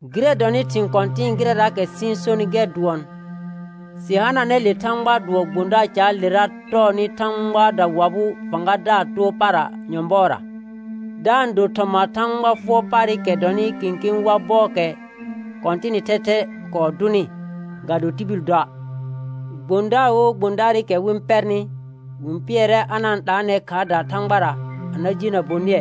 Gɩrɛ dɔnɩ thɩ̃ kɔ̃tɩ̃ɩ gɩrɛraakɛ sɩ-n sonɩ gɛr dʋɔn, sɩ hananɛ le Thãgbaa dʋɔ gbõdaar caalera tɔɔnɩ Thãgba dawabʋʋ fãgadaar too para nyɔ̃bɔɔra, da-n do thɔma Thãgba fʋɔr paarɩkɛ dɔnɩ kẽkẽ wa bɔɔkɛ Kɔ̃tɩnɩ thɛthɛ kɔɔ dʋnɩ, ga do tibil doa'. Gbõdaar wo gbõdaarɩkɛ wɩ-n pɛrnɩ, wɩ-n pɩɛrɛ a na-n 'laanɛ khaardaa Thãgbara a na jenə bonɩɛ,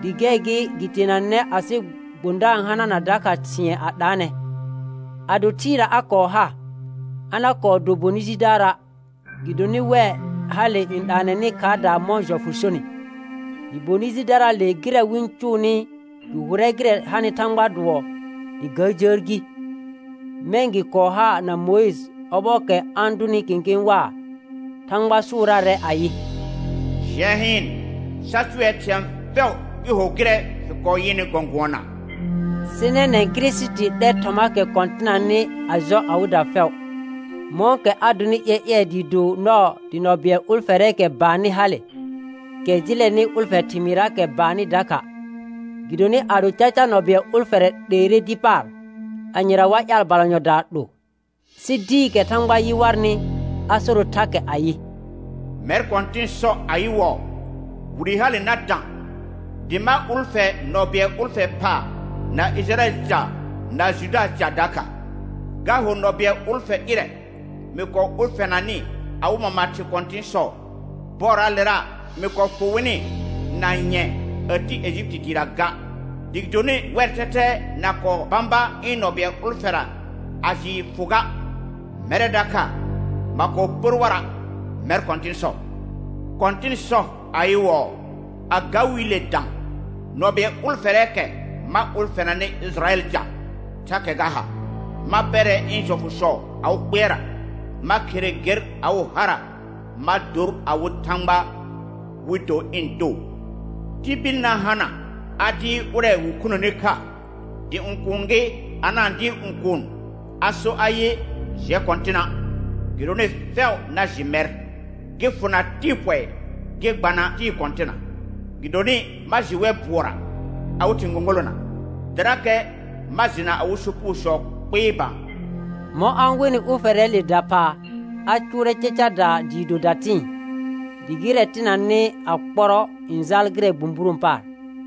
dɩ gɛr gɩ gɩ teenanɛ asɩ gbõdaar n hanana dakha thɩ̃ɛ a 'laanɛ. Ado thɩɩra a kɔɔ ha, a na kɔɔ do bonɩ jidaara', gɩdonɩ wɛ hale n 'laanɛnɩ khaardaa mɔ̃ jɔfʋ sonɩ. Dɩ bonɩ jidaraale gɩrɛ wɩ-n cʋʋnɩ gɩ hʋrɛ gɩrɛ hanɩ Thãgbaa dʋɔ dɩ ga jəər gi; mɛ̃ gɩ kɔɔ ha na Mʋɩjɩ ɔbɔɔkɛ a-n dʋnɩ kẽkẽ waa, Thãgba sʋʋraarɛ ayɩ: «Jɩɛ hɩɩn, sa cʋɛ thɩ̃ɛ fɛʋ gɩ ho gɩrɛ fɩ kɔɔ yɩnɩ gɔ̃gʋɔna.» Sɩ nɛnɛ̃ Kirisiti 'lɛr thɔmaakɛ kɔ̃tɩnanɩ a jɔ awɩda fɛʋ, mɔ̃kɛ a donɩ ƴɛƴɛɛ dɩɩ do nɔɔ dɩ nɔ bɩɛl ʋlfɛrɛɛkɛ baannɩ hale, kɛ jɩlɛnɩ ʋlfɛ thɩmɩɩrraakɛ baannɩ dakha. Gɩdonɩ ado caca nɔ bɩɛl ʋlfɛrɛ 'leere dɩ paar, anyera wa ƴaal balanyɔdaa 'lo? Sɩ dɩɩkɛ Thãgba yɩ warnɩ a soro thakɛ ayɩ: «Mɛr Kɔ̃tɩn sɔ ayɩwɔɔ: Wire hale na dã, dɩ ma ʋlfɛ nɔ bɩɛl ʋlfɛ phaa na Ɩjɩrayɛl ca na Judaa ca dakha; ga ho nɔ bɩɛl ʋlfɛ ƴɩrɛ mɩ kɔɔ ʋlfɛnanɩ awɩ mama thɩ kɔ̃tɩ̃sɔ, bɔɔraalera mɩ kɔɔ fʋ wɩnɩ na nyɛ̃ɛ a ti Ejipiti dɩɩra ga. Dɩ gɩdonɩ wɛr thɛthɛ na kɔɔ bãba ɩ̃ nɔ bɩɛl ʋlfɛra a jɩɩ fʋ ga, mɛrɛ dakha ma kɔɔ pər wara', mɛr Kɔ̃tɩn sɔ. Kɔ̃tɩn sɔ ayɩwɔɔ: A ga wiile dã, nɔ bɩɛl ʋlfɛrɛɛkɛ ma ʋlfɛnanɩ Ɩjɩrayɛl ca, thakɛ ga ha: Ma pɛrɛ ɩ̃ jɔfʋsɔ awɩ kpɩɛrra, ma khere ger awɩ hara; ma dor awɩ Thãgba, wɩ do ɩ̃ too. Tibil na hana a dɩɩr ʋrɛ wɩ khunəni kha, dɩ õkuun gɩ a na-n dɩɩr õkuun a so ayɩ: Jɛ Kɔ̃tɩna'. Gɩdonɩ fɛʋ na jɩ mɛr, gɩ fʋna tɩɩ pɔɩ gɩ gbana tɩɩ kɔ̃tɩna. Gɩdonɩ ma jɩ wɛr bʋɔra awɩ thɩ̃ gõgolona, dɩrakɛ ma jɩna awɩ sopugosɔ kpɩɩ bã.» Mɔ̃ a-n wenɩ ʋlfɛrɛɛle daphaa, a cʋʋrɛ cacadaa dɩɩ do datɩ̃ɩ. Dɩ gɩrɛ tɩnanɩ a kpɔrɔ n jaal gɩrɛ bũburõ paar.